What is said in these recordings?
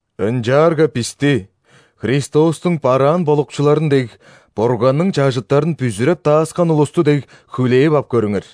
Ынчаарга бисти Христостуң бараан болукчуларын дег, Бурганның чажыттарын бүзүреп дааскан улусту дег хүлээп ап көрүңер.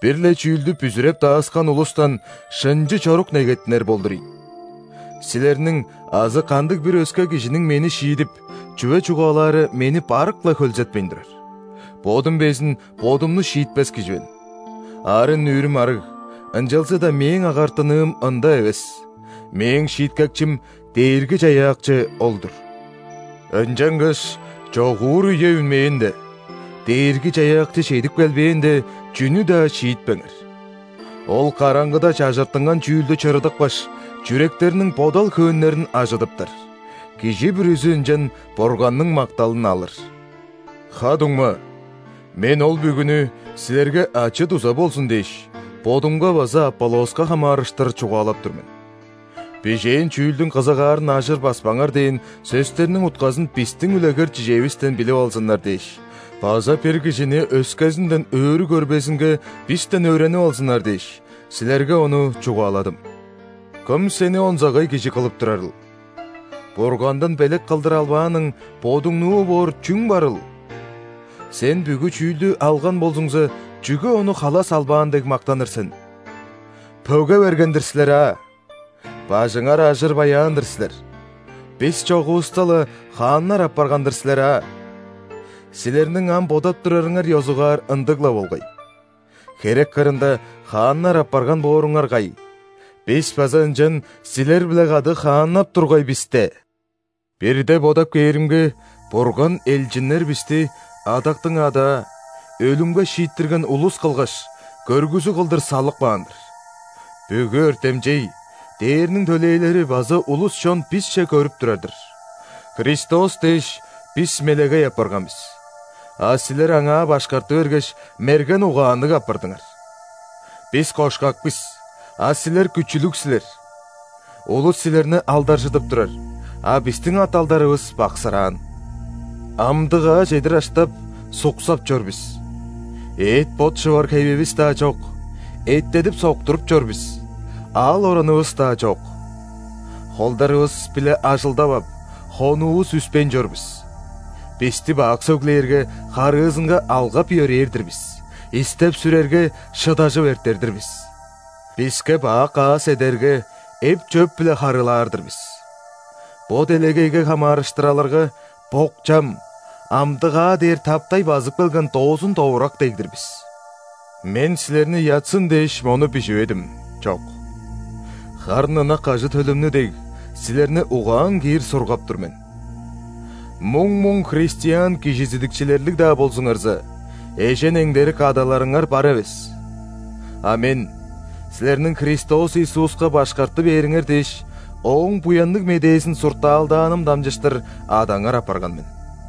Бир-ле чүүлдү бүзүреп дааскан улустан шынчы чорук негеттинер болдур ийин. Силерниң азы кандыг-бир өске кижиниң мени шиидип, чүве чугаалаары мени барык-ла хөлзетпейн турар. Бодум безин бодумну шиитпес кижи мен. Арын-нүүрүм арыг, ынчалза-даа мээң агартыныым ында эвес: мээң шииткекчим – Дээрги-Чаяакчы ол-дур. Ынчангаш чогуур үе үнмээнде, Дээрги-Чаяакчы чедип келбээнде, чүнү-даа шиитпеңер. Ол караңгыда чажыртынган чүүлдү чырыдыпкаш, чүректерниң бодал-хөөннерин ажыдыптар, кижи бүрүзү ынчан Бурганның макталын алыр. Ха-дуңма, мен ол бүгүнү, силерге ачы-дуза болзун дээш, бодумга база Аполлоска хамаарыштыр чугаалап тур мен. «Бижээн чүүлдүң кызыгаарын ажыр баспаңар» – дээн сөстерниң утказын бистиң үлегер-чижээвистен билип алзыннар дээш база бир кижини өскезинден өрү көрбезинге бистен өөренип алзыннар дээш, силерге ону чугааладым. Кым сени онзагай кижи кылып турарыл? Бургандан белек кылдыр албааның, бодуңнуу боор чүң барыл? Сен бүгү чүүлдү алган болзуңза, чүге ону халас албаан дег мактаныр сен? Пөге берген-дир силер аа! Бажыңар ажыр баяан-дыр силер! Бис чогувуста-ла, хааннар апарган-дыр силер аа?! Силерниң ам бодап турарыңар ёзугаар ындыг-ла болгай. Херек кырында хааннар апарган бооруңар кай, бис база ынчан силер-биле кады хааннап тургай бис де! Бирде бодап кээримге, Бурган элчиннер бисти адактың адаа, өлүмге шииттирген улус кылгаш, көргүзүг кылдыр салып каан-дыр. Бүгү өртемчей, ·дээрниң төлээлери база улус-чон бисче көрүп турар-дыр. Христос дээш, бис «мелегей» апарган бис, а силер Аңаа башкарты бергеш, мерген угаанныг апардыңар! Бис кошкак бис, а силер күчүлүг силер! Улус силерни алдаржыдып турар, а бистиң ат-алдарывыс баксыраан. Амдыгаа чедир аштап, суксап чор бис, эът-бот шывар хевивис-даа чок; эттедип-соктуртуп чор бис, аал-оранывыс-даа чок. Холдарывыс-биле ажылдап ап, хонуувус үспейн чор бис. Бисти бак сөглээрге, харыызынга алгап-йөрээр-дир бис; истеп-сүрерге, шыдажып эртер-дир бис. Биске бак аас эдерге, эп-чөп-биле харыылаар-дыр бис. Бо делегейге хамаарыштыр алырга, бок-чам, амдыгаа дээр таптай базып келген доозун-довурак дег-дир бис. Мен силерни ыятсын дээш, мону биживедим, чок! Харын ынак ажы-төлүмнү дег, силерни угаан киир сургап тур мен. Муң-муң христиан кижизидикчилерлиг-даа болзуңарза, эжен-эңдерик адаларыңар бар эвес. А мен, силерниң Христос Иисуска башкарты бээриңер дээш, Ооң Буянныг Медээзин суртаалдааным дамчыштыр адаңар апарган мен.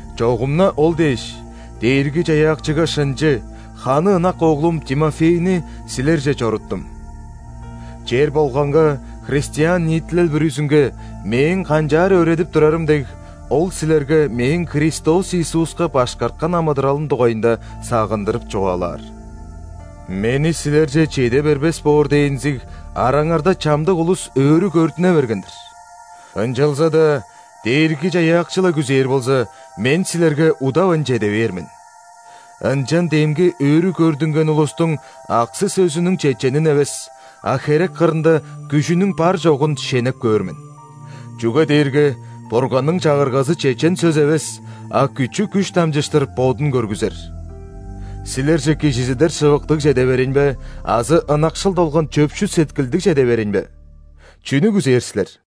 Чогум-на ол дээш, Дээрги-Чаяакчыга шынчы, ханы ынак оглум Тимофейни силерже чоруттум. Чер болганга, христиан ниитилел бүрүзүнге мээң канчаар өөредип турарым дег, ол силерге мээң Христос Иисуска башкарткан амыдыралым дугайында сагындырып чугаалаар. Мени силерже чеде бербес боор дээнзиг, араңарда чамдык улус өрү көрдүне берген-дир. Ынчалза-даа Дээрги-Чаяакчы-ла күзээр болза, мен силерге удавайн чеде бээр мен. Ынчан демги өрү көрдүнген улустуң аксы-сөзүнүң чеченин эвес, а херек кырында күжүнүң бар, чогун шенеп көөр мен. Чүге дээрге Бурганның Чагыргазы чечен сөс эвес, а күчү-күш дамчыштыр Бодун көргүзер. Силерже кижизидер шывыктыг чеде берейн бе азы ынакшыл долган чөпшүл сеткилдиг чеде берейн бе? Чүнү күзээр силер?